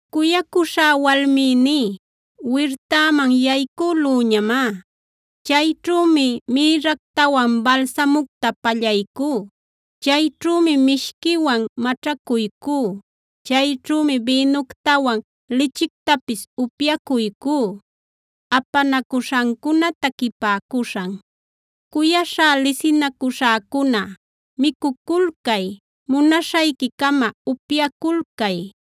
Cuyacuśhá walmïní, wirtäman yaycülüñamá. Chayćhümi mïrractawan balsamucta pallaycú; chayćhümi mishquiwan maćhacuycú; chayćhümi bïnuctawan lichictapis upyacuycú. Apanacuśhancuna taquipäcuśhan Cuyaśhá lisinacuśhäcuna, micuculcay; munaśhayquicama upyaculcay.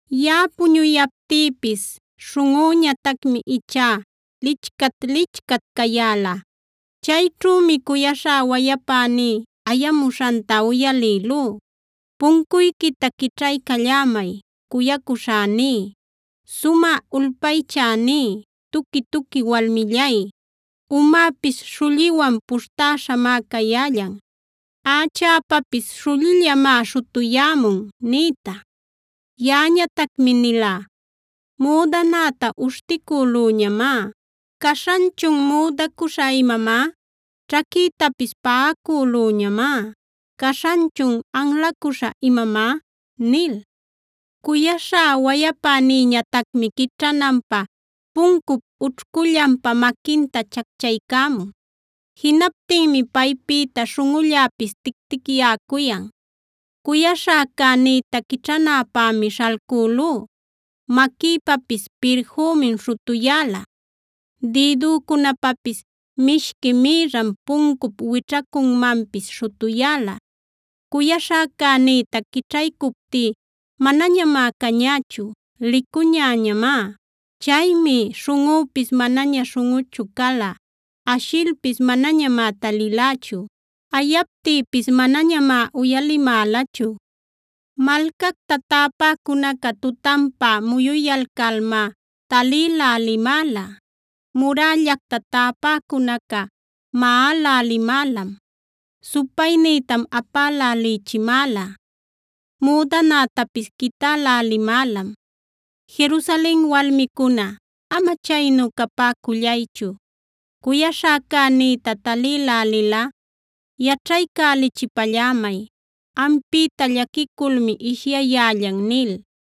Yaꞌa puñuyaptïpis śhunꞌüñatacmi ichá licchat-licchat cayäla. Chayćhümi cuyaśhá wayapäní ayamuśhanta uyalïlú: “Puncuyquita quićhaycallämay, cuyacuśhäní, sumä ulpaychäní, tuqui-tuqui walmillay. Umäpis śhulliwan puśhtäśhamá cayällan; ächäpapis śhullillamá śhutuyämun” nïta. Yaꞌañatacmi nilá: “Müdanäta uśhticülüñamá, ¿caśhanchun müdacuśha imamá? Ćhaquïtapis paꞌacülüñamá, ¿caśhanchun anlacuśha imamá?” nil. Cuyaśhá wayapänïñatacmi quićhananpä puncup ućhcullanpa maquinta chacchaycämun. Jinaptinmi paypïta śhunꞌulläpis tic-ticyäcuyan. Cuyaśhäcänïta quićhanäpämi śhalcülú, maquïpapis pirfümim śhutuyäla, dïdücunapapis mishqui mïrram puncup wićhacunmanpis śhutuyäla. Cuyaśhäcänïta quićhaycuptí manañamá cañächu; licuñäñamá. Chaymi śhunꞌüpis manaña śhunꞌuchu cala. Ashilpis manañamá talilächu; ayaptïpis manañamá uyalimälachu. Malcacta täpäcunaca tutanpa muyuyalcalmá talïlälimäla; murällacta täpäcunaca maꞌälälimälam, supaynïtam apälälïchimäla, müdanätapis quitälälimälam. Jerusalen walmicuna, ama chaynu capäcullaychu, cuyaśhäcänïta talïlälilꞌa yaćhaycälichipallämay: “Ampïta llaquiculmi ishyayällan” nil.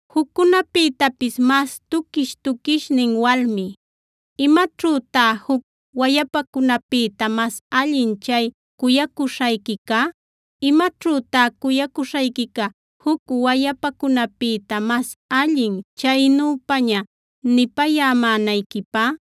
Juccunapïtapis mas tuquish-tuquishnin walmi, ¿imaćhütá juc wayapacunapïta mas allin chay cuyacuśhayquica? ¿Imaćhütá cuyacuśhayquica juc wayapacunapïta mas allin chaynüpaña nipayämänayquipä?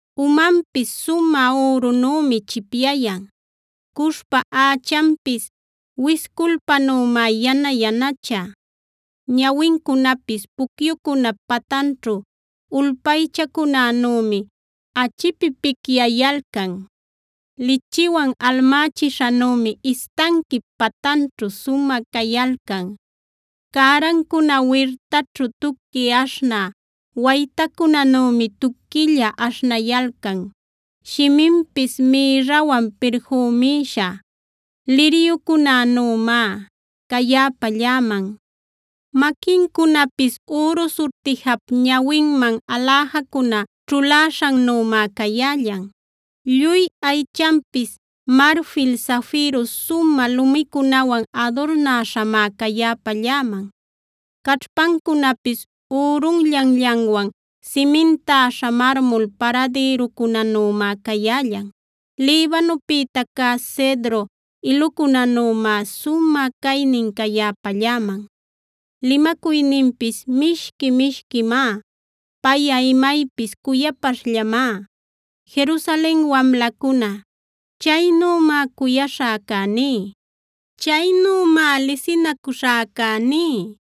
Umanpis sumä ürunümi chipyayan; cushpa ächanpis wisculpanümá yana-yanacha. Ñawincunapis pucyucunap patanćhu ulpaychacunänümi achipipicyayalcan; lichiwan almächishanümi istanquip patanćhu sumä cayalcan. Cärancuna wirtaćhu tuqui aśhnä waytacunänümi tuquilla aśhnayalcan; shiminpis mïrrawan pirfümïśha liryucunänümá cayäpalläman. Maquincunapis üru surtijap ñawinman aläjacuna ćhuläśhannümá cayällan. Lluy aychanpis marfil zafiro sumä lumicunawan adurnäśhamá cayäpalläman. Caćhpancunapis ürunllanllanwan simintäśha marmul paradïrucunänümá cayällan. Libanopïta cä cedro ilucunänümá sumä caynin cayäpalläman. Limacuyninpis mishqui-mishquimá; payꞌa maypis cuyapaśhllamá. Jerusalen wamlacuna, chaynümá cuyaśhäcäní, chaynümá lisinacuśhäcäní.